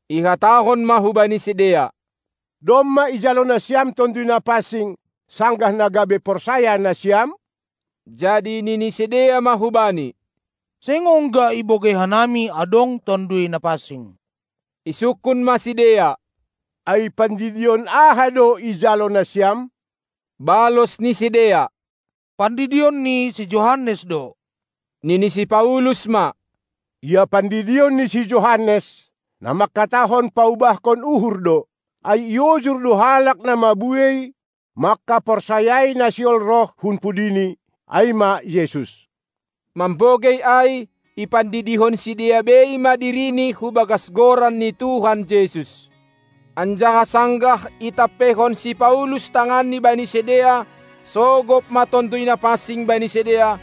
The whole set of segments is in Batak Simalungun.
Ihatahon ma hubani sidea: Domma ijalo nasiam Tonduy Napansing, sanggah na gabe porsaya nasiam? Jadi nini sidea ma hubani: Seng ongga ibogei hanami adong Tonduy Napansing! Isungkun ma sidea: Ai pandidion aha do ijalo nasiam? Balos ni sidea: Pandidion ni si Johannes do. Nini si Paulus ma: Ia pandidion ni si Johannes, na mangkatahon paubahkon uhur do, ai iojur do halak na mabuei mangkaporsayai na sihol roh hun pudini, ai ma Jesus. Mambogei ai, ipandidihon sidea bei ma dirini hu bagas Goran ni Tuhan Jesus. Anjaha sanggah itampeihon si Paulus tanganni bani sidea, sogop ma Tonduy Napansing bani sidea,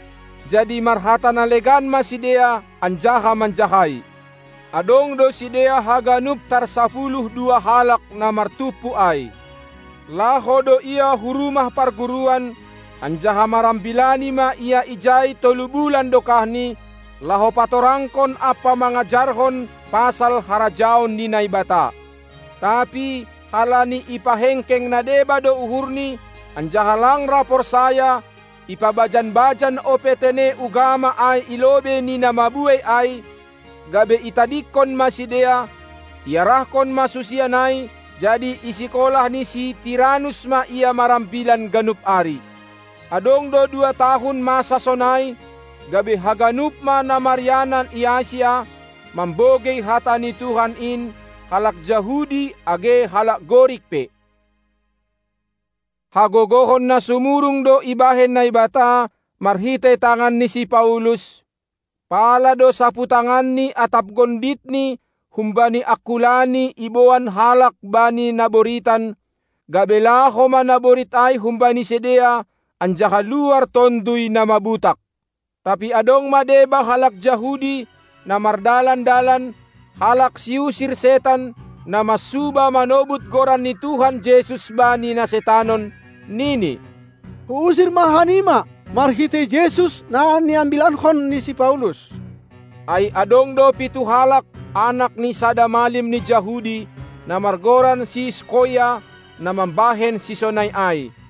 jadi marhata na legan ma sidea anjaha manjahai. Adong do sidea haganup tarsapuluh dua halak na martumpu ai. Laho do ia hu rumah parguruan, anjaha marambilani ma ia ijai tolu bulan dokahni, laho patorangkon ampa mangajarhon pasal harajaon ni Naibata. Tapi halani ipahengkeng na deba do uhurni, anjaha lang ra porsaya, ipabajan-bajan ope tene ugama ai i lobei ni na mabuei ai, gabe itadingkon ma sidea; iarahkon ma susian ai jadi i sikolah ni si Tiranus ma ia marambilan ganup ari. Adong do dua tahun masa sonai, gabe haganup ma na marianan i Asia, mambogei hata ni Tuhan in, halak Jahudi age halak Gorik pe. Hagogohon na sumurung do ibahen Naibata marhitei tangan ni si Paulus, pala do saputanganni atap gonditni humbani angkulani iboan halak bani na boritan, gabe laho ma naborit ai humbani sidea anjaha luar tonduy na mabutak. Tapi adong ma deba halak Jahudi, na mardalan-dalan, halak siusir setan, na mansuba manobut Goran ni Tuhan Jesus bani na setanon, nini: Huusir ma hanima, marhitei Jesus, na niambilankon ni si Paulus! Ai adong do pitu halak, anak ni sada malim ni Jahudi, na margoran si Skoia, na mambahen sisonai ai.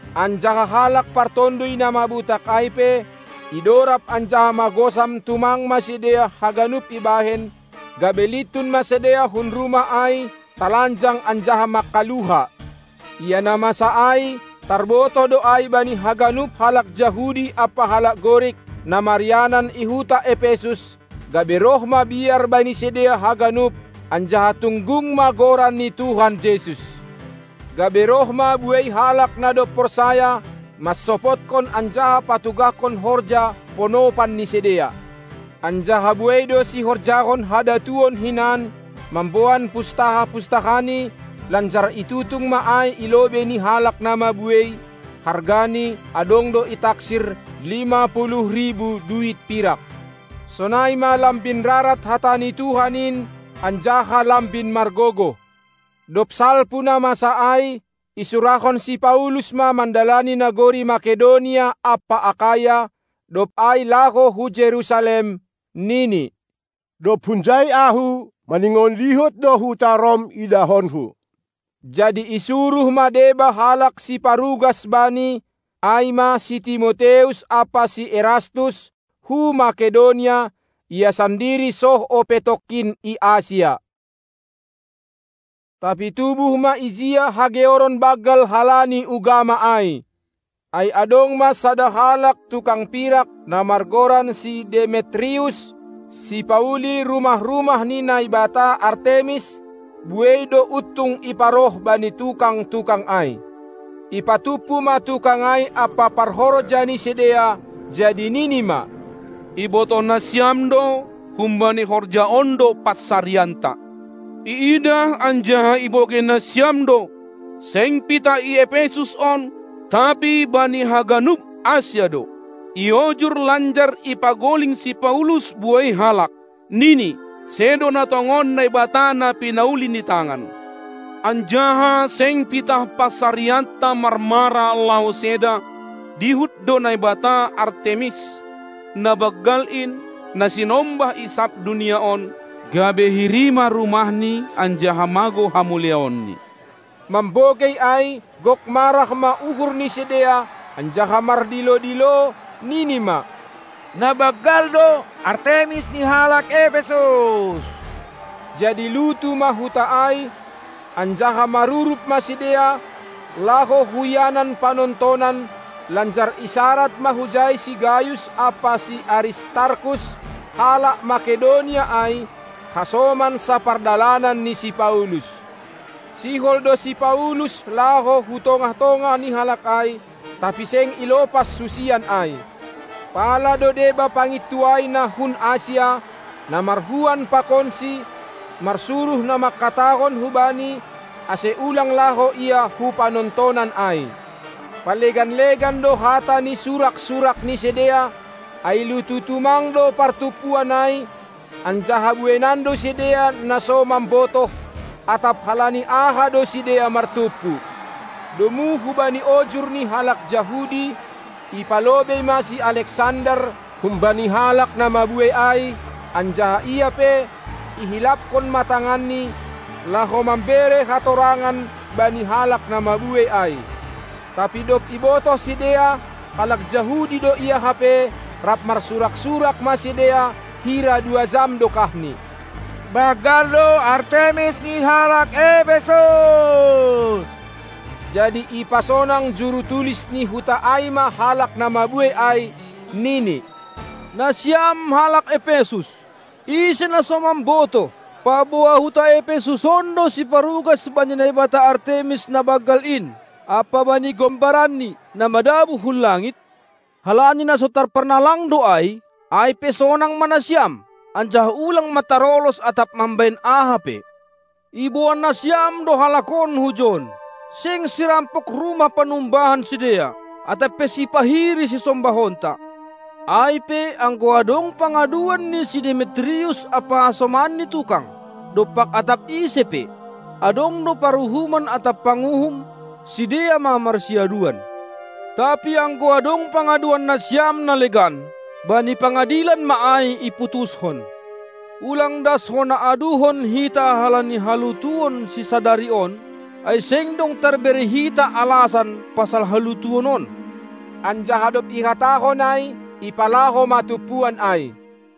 Anjaha halak partonduy na butak ai pe, idorab anjaha magosam tumang ma sidea haganupan ibahen, gabe lintun ma sidea hun rumah ai, talanjang anjaha mangkaluha. Ia na masa ai, tarbotoh do ai bani haganup halak Jahudi ampa halak Gorik, na marianan i huta Epesus, gabe roh ma biar bani sidea haganup, anjaha tunggung ma Goran ni Tuhan Jesus. Gabe roh ma buei halak na dob porsaya, mansopotkon anjaha patugahkon horja ponopan ni sidea. Anjaha buei do sihorjahon hadatuon hinan, mamboan pustaha-pustahani, lanjar itutung ma ai i lobei ni halak na mabuei; hargani, adong do itaksir lima ribu duit pirak. Sonai ma lambin rarat hata ni Tuhan in anjaha lambin margogoh. Dob salpu na masa ai, isurahon si Paulus ma mandalani nagori Makedonia ampa Akaya, dob ai laho hu Jerusalem, nini: Dob hunjai ahu, maningon dihut do huta Rom idahonku. Jadi isuruh ma deba halak siparugas bani, ai ma si Timoteus ampa si Erastus, hu Makedonia; ia sandiri soh ope tongkin i Asia. Tapi tubuh ma ijia hageoron banggal halani ugama ai. Ai adong ma sada halak, tukang pirak, na margoran si Demetrius, sipauli rumah-rumah ni naibata Artemis; buei do untung iparoh bani tukang-tukang ai. Ipatumpu ma tukang ai ampa parhorja ni sidea, jadi nini ma: Ibotoh nasiam do, humbani horja on do pansarianta. Iidah anjaha ibogei nasiam do, seng pitah i Epesus on, tapi bani haganup Asia do, iojur lanjar ipagoling si Paulus buei halak. Nini, sedo na tongon naibata na pinauli ni tangan. Anjaha seng pitah pansarianta marmara laho seda, dihut do naibata Artemis na banggal in, na sinombah i sab dunia on, gabe hiri ma rumahni anjaha magou hamuliaonni. Mambogei ai gok marah ma uhur ni sidea, anjaha mardilo-dilo, nini ma: Na banggal do Artemis ni halak Epesus! Jadi lutu ma huta ai, anjaha marurup ma sidea, laho hu ianan panontonan, lanjar isarad ma hujai si Gayus ampa si Aristarkus, halak Makedonia ai, hasoman sapardalanan ni si Paulus. Sihol do si Paulus laho hu tongah-tongah ni halak ai, tapi seng ilopas susian ai. Pala do deba pangintuai na hun Asia, na marhuan pakonsi, marsuruh na mangkatahon hubani, ase ulang laho ia hu panontonan ai. Palegan-legan do hata ni surak-surak ni sidea, ai lutu tumang do partumpuan ai, anjaha bueinan do sidea na so mambotoh, atap halani aha do sidea martumpu. Domu hubani ojur ni halak Jahudi, ipalobei ma si Aleksander humbani halak na mabuei ai, anjaha ia pe, ihilaphon ma tanganni laho mambere hatorangan bani halak na mabuei ai. Tapi dob ibotoh sidea, halak Jahudi do ia hape, rap marsurak-surak ma sidea, hira dua jam dokahni: Banggal do Artemis ni halak Epesus! Jadi ipasonang juru-tulis ni huta ai ma halak na mabuei ai, nini: Nasiam halak Epesus, ise na so mambotoh, paboa huta Epesus on do siparugas bani naibata Artemis na banggal in, ampa bani gombaranni, na madabuh hun langit? Halani na so tarparnalang do ai, ai pe sonang ma nasiam, anjaha ulang ma tarolos atap mambahen aha pe. Iboan nasiam do halak on hujon, seng sirampok rumah panumbahan sidea, atap pe sipahiri sisombahonta. Ai pe anggo adong pangaduan ni si Demetrius ampa hasomanni tukang dompak atap ise pe, adong do paruhuman atap panguhum; sidea ma marsiaduan. Tapi anggo adong pangaduan nasiam na legan, bani pangadilan ma ai iputushon. Ulang das hona aduhon hita halani halutuon sisadari on, ai seng dong tarbere hita alasan pasal halutuon on. Anjaha dob ihatahon ai, ipalaho ma tumpuan ai.